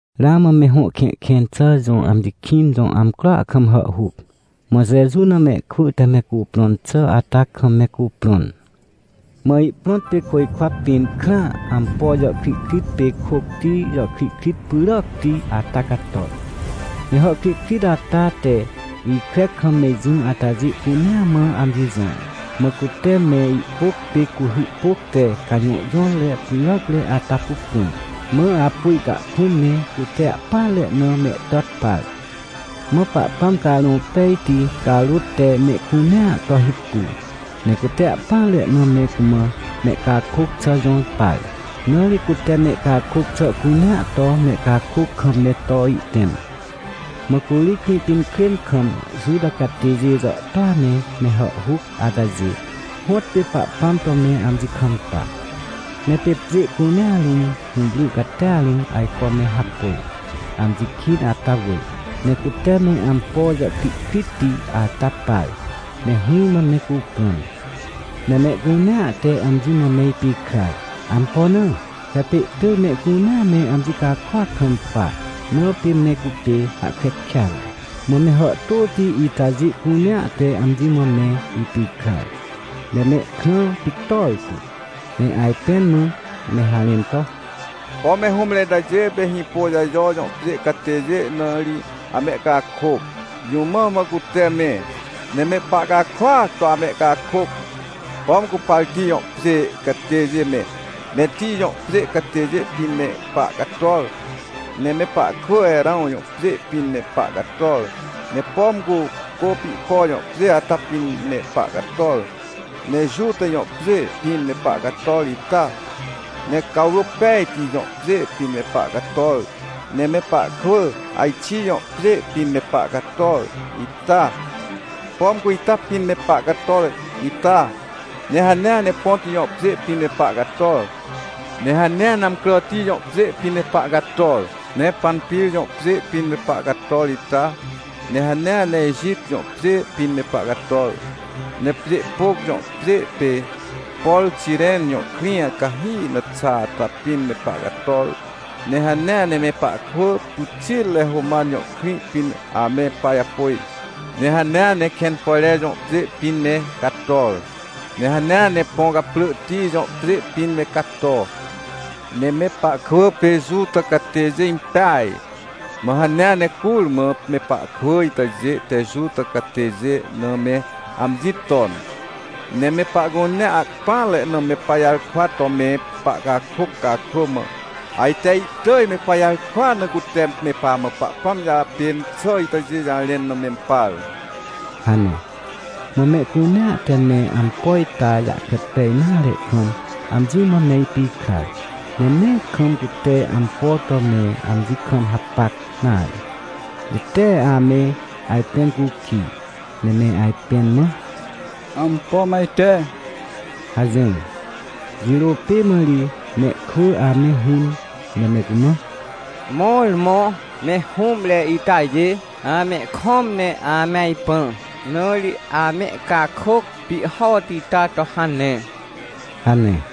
Ramã me Hõ Kẽhkẽn xà jõ amji kĩn jõ amcroa kam hàhhuc, mã Jeju na mehkwỳ te me cuprõn xà ata kam me cuprõn. Mã ihprõt pê côjkwa pĩn, krã, ampo jàhkrihkrit pê kôcti jàhkrihkrit pyràacti ata cator. Ne hàhkrihkrit ata te ikre kam me jỹ atajê cunea mã amji jõr. Mã cute me ihpôc pê cuhy pôc te cajõhjõtre pyràcre ata pupun. Mã apu ihcahkũm ne cute ahpỹanre na mehtàt par. Mã Pahpãm Carõ Pejti carôt te mehcunea to hipu. Ne cute ahpỹanre na me cumã mehcakôc xà jõr par. Na ri cute mehcakôc xà cunea to mehcakôc kam me to ihtẽm. Mã curi Krĩpinkrên kam Juta catêjê jàhtôa ne me hàhhuc atajê, hõtpê Pahpãm to me amji kampa. Ne pê pjê cunea rũm hũwry catia rũm ajco me hapôj, amji kĩn ata wỳr. Ne cute me ampo jàhkrihkritti ata par, ne hỹrmã me cuprõn. Ne mehcunea te amji mã me ipikrar. Ampo na? He pê ihtỳj mehcunea me amji cakôac kampa, na pê me cupê hahkre kêatre. Mã me hàhtôti itajê cunea te amji mã me ipikrar, ne mehkrã pictor tu, ne ajpẽn mã me harẽn to: — Pom me hũmre itajê pê Hĩpôjajo jõ pjê catêjê na ri amehcakôc. Jũ mã mã cute me, ne me pahcakôac to amehcakôc? Pom cu Partij jõ pjê catêjê me, Metij jõ pjê catêjê pĩn me pahcator, ne me pahkwỳ Erãw jõ pjê pĩn me pahcator, ne pom cu Côpihpo jõ pjê ata pĩn me pahcator, ne Juta jõ pjê pĩn me pahcator ita, ne Cawrôpejti jõ pjê pĩn me pahcator, ne me pahkwỳ Axij jõ pjê pĩn me pahcator ita? Pom cu ita pĩn me pahcator ita, ne hanea ne Ponto jõ pjê pĩn me pahcator. Ne hanea ne Amcràti jõ pjê pĩn me pahcator, ne Panpir jõ pjê pĩn me pahcator ita, ne hanea ne Ejit jõ pjê pĩn me pahcator. Ne Pjêhpôc jõ pjê pê, por Xiren jõ krĩ cahi na xa ata pĩn me pahcator, ne hanea ne me pahkwỳ pyxitre Roman jõ krĩ pĩn ame pajapôj. Ne hanea ne Kẽnpojre jõ pjê pĩn me cator, ne hanea ne Põcaprỳhti jõ pjê pĩn me cator. Ne me pahkwỳ pê Juta catêjê impeaj, mã hanea ne curmã me pahkwỳ itajê te Juta catêjê na me amji ton. Ne me pahcunea, ahpỹanre na me pajarkwa to me pahcakôc cakrô, mã ajte ihtỳj me pajarkwaa na cute me pamã Pahpãm jàpên xà itajê jarẽn na mempar — hane. Mã mehcunea te me ampo ita jahkre pej nare kam amji mã me ipikrar, ne nee kam cute ampo to me amji kam hapac nare, ne tee ame ajpẽn cukij, ne me ajpẽn mã: — Ampo mã ajte? — hajỹr. Jirô pê mã ri mehkwỳ ame hũn ne me cumã: — Mõrmõ me hũmre itajê amehkõm ne ame ajpã, na ri amehcakôc pihhoti ita to hane — hane.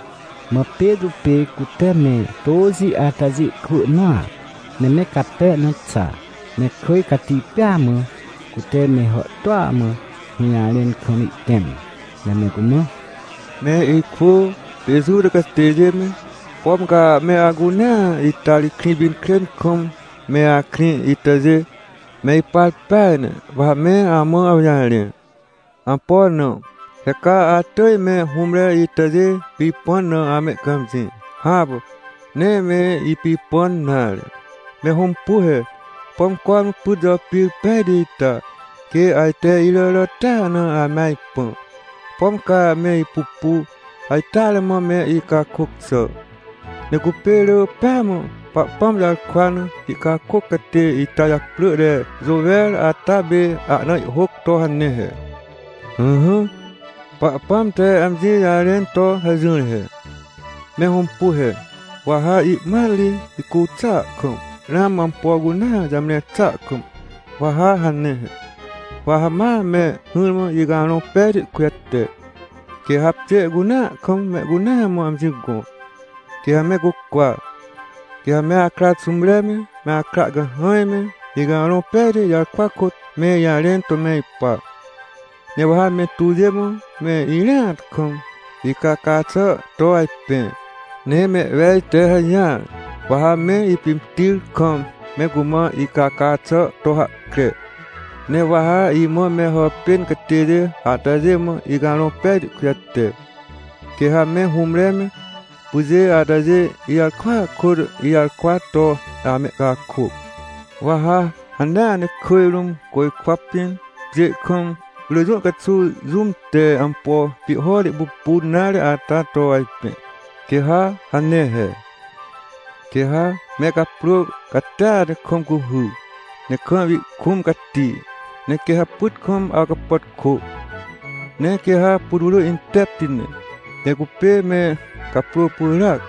Mã Petrô pê cute me tôxi atajê kwỳ nõa, ne me cape na xa, ne kỳj cati pêa mã, cute me hàhtôa mã hũjarẽn kam ihtẽm, ne me cumã: — Me ikwỳ pê Juta catêjê me, pom ca me acunea ita ri Krĩpinkrên kam me akrĩ itajê! Me ipar peaj ne! Wa ha me amã awjarẽ! Ampo na? He ca atỳj me hũmre itajê pipãn na amehcãmjĩ. Hãpà, nee me ipipãn nare. Me hõmpu he. Pom cormã pyt jàpir pejti ita? Quê ajte iràràtia na ame ajpã? Pom ca me ipupu, ajteare mã me icakôc xà, ne cupê rỳ pêa mã Pahpãm jarkwa na ihcakôc catê ita japrỳ te Jôwer ata pê ahna ihhôc to hane he: “Ỹhỹ, Pahpãm te amji jarẽn to hajỹr he: ‘Me hõmpu he, wa ha ihmat ri, hicu xàa kam, ramã ampo cunea jamre xàa kam wa ha hane he: Wa ha ma me hỹrmã Icarõ Pejti kujate, quê ha pjê cunea kam mehcunea mã amji gõ, quê ha me cucwa. Quê ha me akra xũmre me, me akra cahãj me, Icarõ Pejti jarkwa kôt me ijarẽn to me ipa. Ne wa ha mentuwjê mã, me irĩat kam, icaca xà to ajpẽ. Ne mehwej te hajỹar, wa ha me ipimtir kam me cumã icaca xà to hahkre. Ne wa ha imã me hàpên catêjê atajê mã Icarõ Pejti kujate. Quê ha me hũmre me, pyjê atajê ijarkwaa kôt ijarkwa to amehcakôc. Wa ha hanea ne kỳj rũm, côjkwa pĩn, pjê kam, rỳ jũ caxuw jũm te ampo pihhoti pupun nare ata to ajpẽ, quê ha hane he: Quê ha me caprô catia ne kam cuhy, ne kam ihkũm cati. Ne quê ha pyt kam awcapàtkô, ne quê ha putwrỳ intepti ne, ne cupê me caprô pyràac.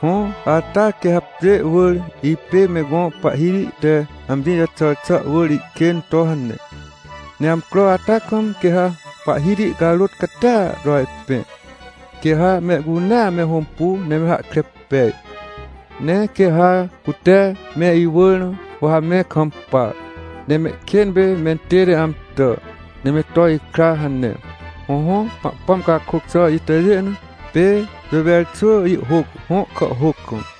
Hõ, ata quê ha pjê wỳr ipê me gõ Pahhiti te amji jaxàr xà wỳr ihkên to hane. Ne amcro ata kam quê ha Pahhiti carôt catia to ajpẽ, quê ha mehcunea me hõmpu ne me hahkre pej. Ne quê ha cute me iwỳr na, wa ha me kampa, ne mehkên pê mentête amtà, ne me to ikra’” hane. Hõhõ, Pahpãm cakôc xà itajê na, pê Jôwer xwỳ ihhôc, hõ kàhhôc kam.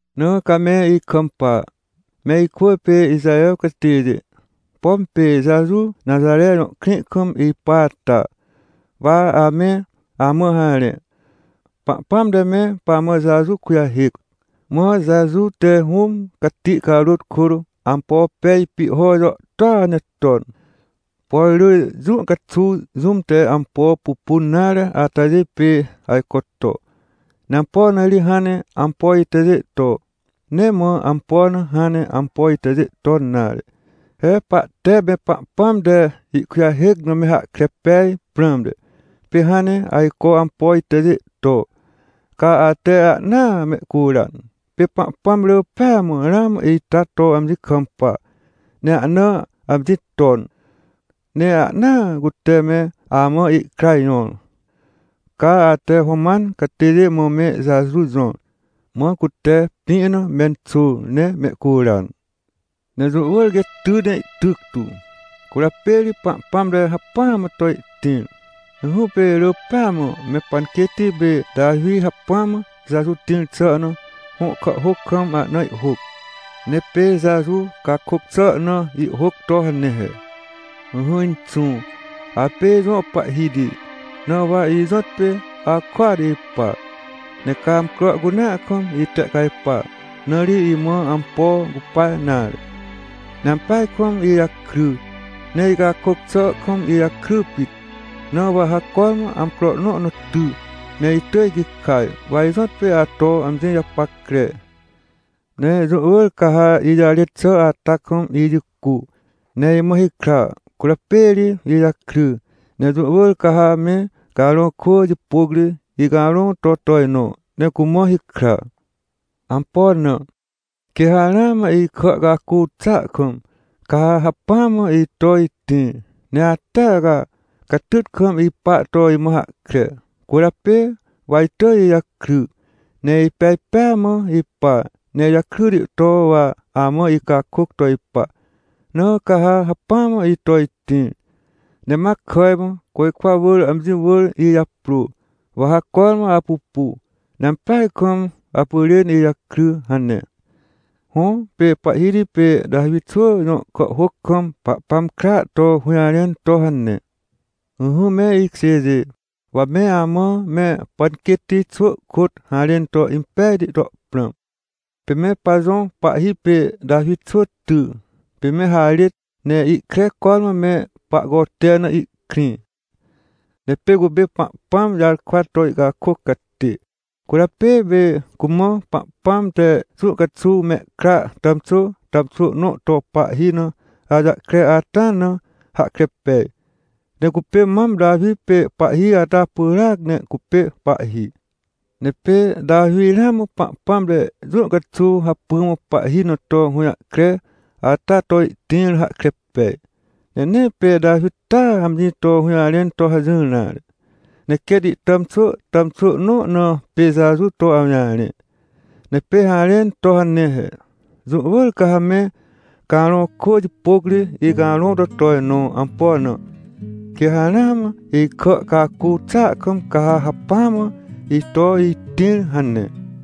— Na ca me ikampa, me ikwỳ pê Ixaher catêjê, pom pê Jeju Naxare jõ krĩ kam ipa ata, wa ame amã harẽ. Pahpãm te me pamã Jeju kujahêc, mã Jeju te Hũm Cati carôt kôt ampo pej pihho jàhtôa ne ton. Por rỳ jũ caxuw jũm te ampo pupun nare atajê pê ajco to. Ne ampo na ri hãn ne ampo itajê to? Nee mã ampo na hãn ne ampo itajê ton nare. He pahte me Pahpãm te ihkujahêc na me hahkre pej prãmte, pê hãn ne ajco ampo itajê to. Ca ate ahnaa mehcuran. Pê Pahpãm rỳ pêa mã ramã ita to amji kampa, ne ahna amji ton. Ne ahnaa cute me amã ihkra jõr. Ca ate Roman catêjê mã me Jeju jõr, mã cute pĩ na menxôr, ne mehcuran. — Ne jũ wỳr quê ty ne ihtyc tu, cwỳrjapê ri Pahpãm te hacpỹa mã to ihtĩr. Ỹhỹ, pê rỳ pêa mã me panquêtti pê Tawi hacpỹ mã Jeju tĩr xà na hõ kàhhôc kam ahna ihhôc. Ne pê Jeju cakôc xà na ihhôc to hane he: “Ỹhỹ Inxũ, apê ijõ Pahhiti, na wa ijõtpê akôat ipa. Ne ca amcro cunea kam itehcajpa, na ri imã ampo cupa nare. Ne ampeaj kam ijakry, ne icakôc xà kam ijakry pit. Na wa ha cormã amcro nõ na ty, ne itỳj gikaj. Wa ijõtpê ato amji japackre. Ne jũ wỳr ca ha ijarêt xà ata kam ijicu, ne imã hikra, cwỳrjapê ri ijakry. Ne jũ wỳr ca ha me carõ kwỳ jipôc ri icarõ to tojnõ, ne cumã hikra. Ampo na? Quê ha ramã ikà cacu xàa kam, ca ha hacpỹa mã ito itĩr. Ne atea ca, catyt kam ipa to imã hahkre. Cwỳrjapê wa itỳj ijakry, ne ipej pêa mã ipa. Ne ijakryti to wa amã icakôc to ipa. Na ca ha hacpỹa mã ito itĩr. Ne ma kàj mã, côjkwa wỳr amji wỳr ijaprô. Wa ha cormã apupu, ne ampeaj kam apyrên ijakry” hane. Hõ, pê pahhiti pê Tawi xwỳ jõ kàhhôc kam Pahpãm kra to hũjarẽn to hane. — Ỹhỹ, me ikjêjê, wa me amã me panquêtti xwỳ kôt harẽn to impejti to prãm. Pê me pajõ pahhi pê Tawi xwỳ ty, pê me harêt, ne ihkre cormã me pahcote na ihkrĩ. Ne pê cupê Pahpãm jarkwa to ihcakôc catê, cwỳrjapê pê cumã Pahpãm te jũ caxuw mehkra tàmxwỳ tàmxwỳ nõ to pahhi na awjahkre ata na hahkre pej. Ne cupê mam Tawi pê pahhi ata pyràac ne cupê pahhi. Ne pê Tawi ramã Pahpãm te jũ caxuw hacpỹa mã pahhi na to hũjahkre ata to ihtĩr na hahkre pej. Ne nee pê Tawi taa amji to hũjarẽn to hajỹr nare, ne quêt ihtàmxwỳ tàmxwỳ nõ na pê Jeju to awjarẽ. Ne pê harẽn to hane he: “Jũ wỳr ca ha me carõ kwỳ jipôc ri icarõ to tojnõ. Ampo na? Quê ha ramã ikà cacu xàa kam ca ha hacpỹa mã ito itĩr” hane.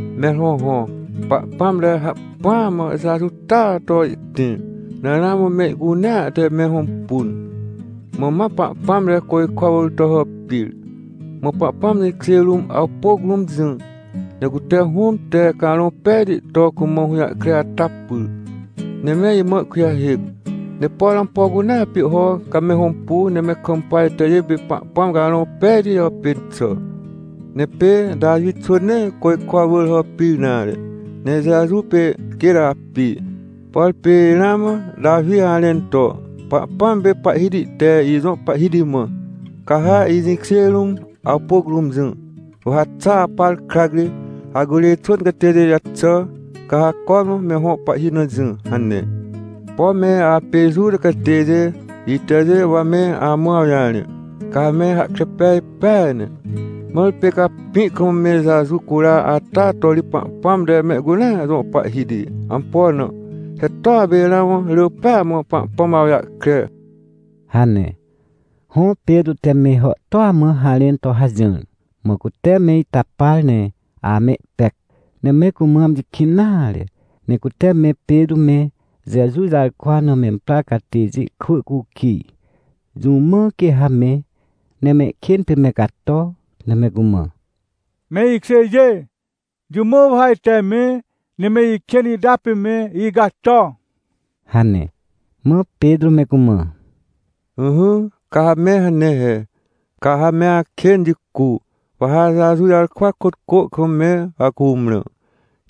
— Mẽr hõhõ, Pahpãm te hacpỹa mã Jeju taa to ihtĩr, na ramã me icunea te me hõmpun. Mã ma Pahpãm te côjkwa wỳr to hàpir, mã Pahpãm jĩkjê rũm, awpôc rũm jỹ. Ne cute Hũm te Carõ Pejti to cumã hũjahkre ata pyr, ne me imã ihkujahêc. Ne por ampo cunea pihho, ca me hõmpu, ne me kampa itajê pê Pahpãm Carõ Pejti jàpên xà. Ne pê Tawi xwỳ nee côjkwa wỳr hàpir nare, ne Jeju pê quêt api. Por pê ramã Tawi harẽn to: “Pahpãm pê Pahhiti te ijõ Pahhiti mã: ‘Ca ha ijĩkjê rũm, awpôc rũm jỹ, wa ha xa apar krac ri acurê xwỳn catêjê jaxà, ca ha cormã me hõ pahhi na jỹ’” hane. — Pom me apê Juta catêjê, itajê wa me amã awjarẽ, ca ha me hahkre pej peaj ne. Mãr pê ca pĩ kam me Jeju cura ata to ri Pahpãm te mehcunea jõ pahhiti. Ampo na? He toa pê ramã rỳ pêa mã Pahpãm awjahkre — hane. Hõ, Petrô te me hàhtôa mã harẽn to hajỹr. Mã cute me ita par ne amehpec, ne me cumã amji kĩn nare, ne cute me Petrô me, Jeju jarkwa na memprar catêjê kwỳ cukij, jũ mã quê ha me, ne mehkên pê me cato, ne me cumã: — Me ikjêjê, jũ mã wa ha ajte me, ne me ikên ita pê me icato? — hane. Mã Petrô me cumã: — Ỹhỹ, ca ha me hane he. Ca ha me akên jicu, wa ha Jeju jarkwa kôt cô kam me acumrã,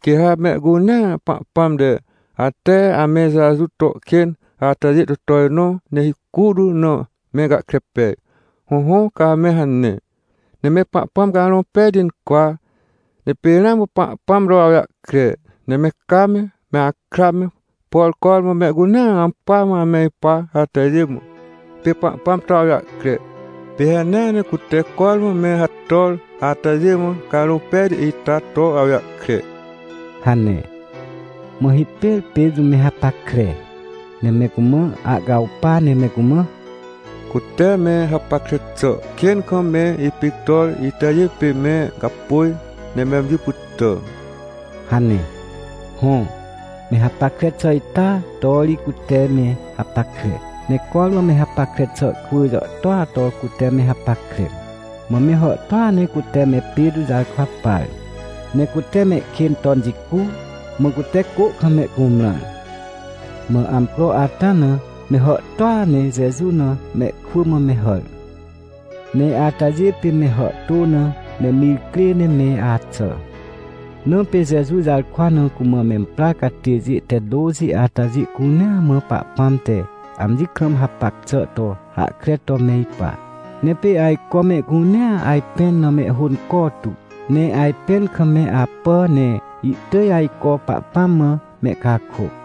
quê ha mehcunea Pahpãm te, ate ame Jeju to kên atajê to tojnõ ne hicu tu na me gahkre pej. Hõhõ, ca ha me hane, ne me Pahpãm Carõ Pejti incwa, ne pê ramã Pahpãm to awjahkre. Ne me ca me, me akra me, por cormã mehcunea ampỳa mã ame ipa atajê mã, pê Pahpãm to awjahkre. Pê hanea ne cute cormã me hator atajê mã Carõ Pejti ita to awjahkre — hane. Mã hipêr Petrô me hapackre, ne me cumã ahcawpa ne me cumã: — Cute me hapackre xà kên kam me ipictor itajê pê me gapôj, ne me amji pytà — hane. Hõ, me hapackre xà ita to ri cute me hapackre, ne cormã me hapackre xà kwỳ jàhtôa to cute me hapackre. Mã me hàhtôa ne cute me Petrô jarkwa par, ne cute mehkên ton jicu, mã cute cô kam mehcumrãr. Mã amcro ata na, me hàhtôa ne Jeju na mehkwỳ mã me hàr. Ne atajê pê me hàhtô na me mir crê ne me axà. Na pê Jeju jarkwa na cumã memprar catêjê te tôxi atajê cunea mã Pahpãm te amji kam hapac xà to hahkre to me ipa. Ne pê ajco mehcunea ajpẽn na mehhônco tu, ne ajpẽn kam me apà, ne ihtỳj ajco Pahpãm mã mehcakôc.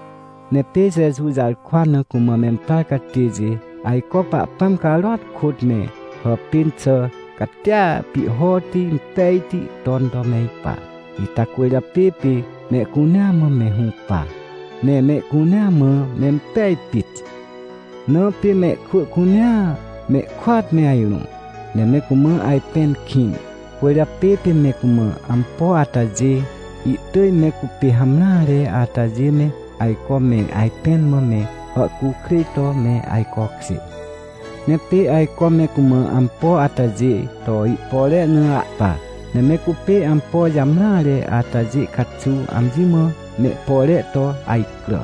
Ne pê Jeju jarkwa na cumã memprar catêjê ajco Pahpãm carôat kôt me hàpên xà catia pihhoti impejti ton to me ipa. Ita cwỳrjapê pê mehcunea mã me hũpa, ne mehcunea mã mempej pit. Na pê mehkwỳ cunea mehkôat me ajrõ, ne me cumã ajpẽn kĩn. Cwỳrjapê pê me cumã ampo atajê, ihtỳj me cupê hamreare atajê me ajco me ajpẽn mã me hàhcukrêj to me ajcokjê. Ne pê ajco me cumã ampo atajê to ihpore na ahpa, ne me cupê ampo jamreare atajê caxuw amji mã mehpore to ajcrà.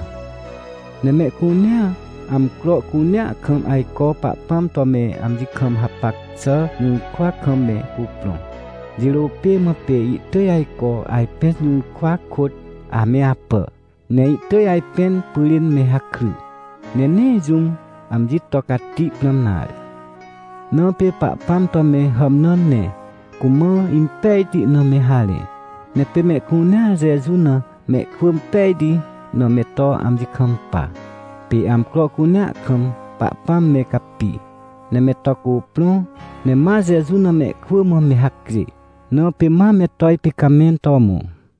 Ne mehcunea, amcro cunea kam ajco Pahpãm to me amji kam hapac xà jũrkwa kam me cuprõ. Jirô pê mã pê ihtỳj ajco ajpẽn jũrkwa kôt ame apà, ne ihtỳj ajpẽn pyrên me hakry, ne nee jũm amji to cati prãm nare. Na pê Pahpãm to me hàmnãn ne cumã impejti na me harẽ. Ne pê mehcunea Jeju na mehkwỳ impejti na me to amji kampa. Pê amcro cunea kam Pahpãm me capi, ne me to cuprõ, ne ma Jeju na mehkwỳ mã me hacjê, na pê ma me to ipicamẽn to mõ.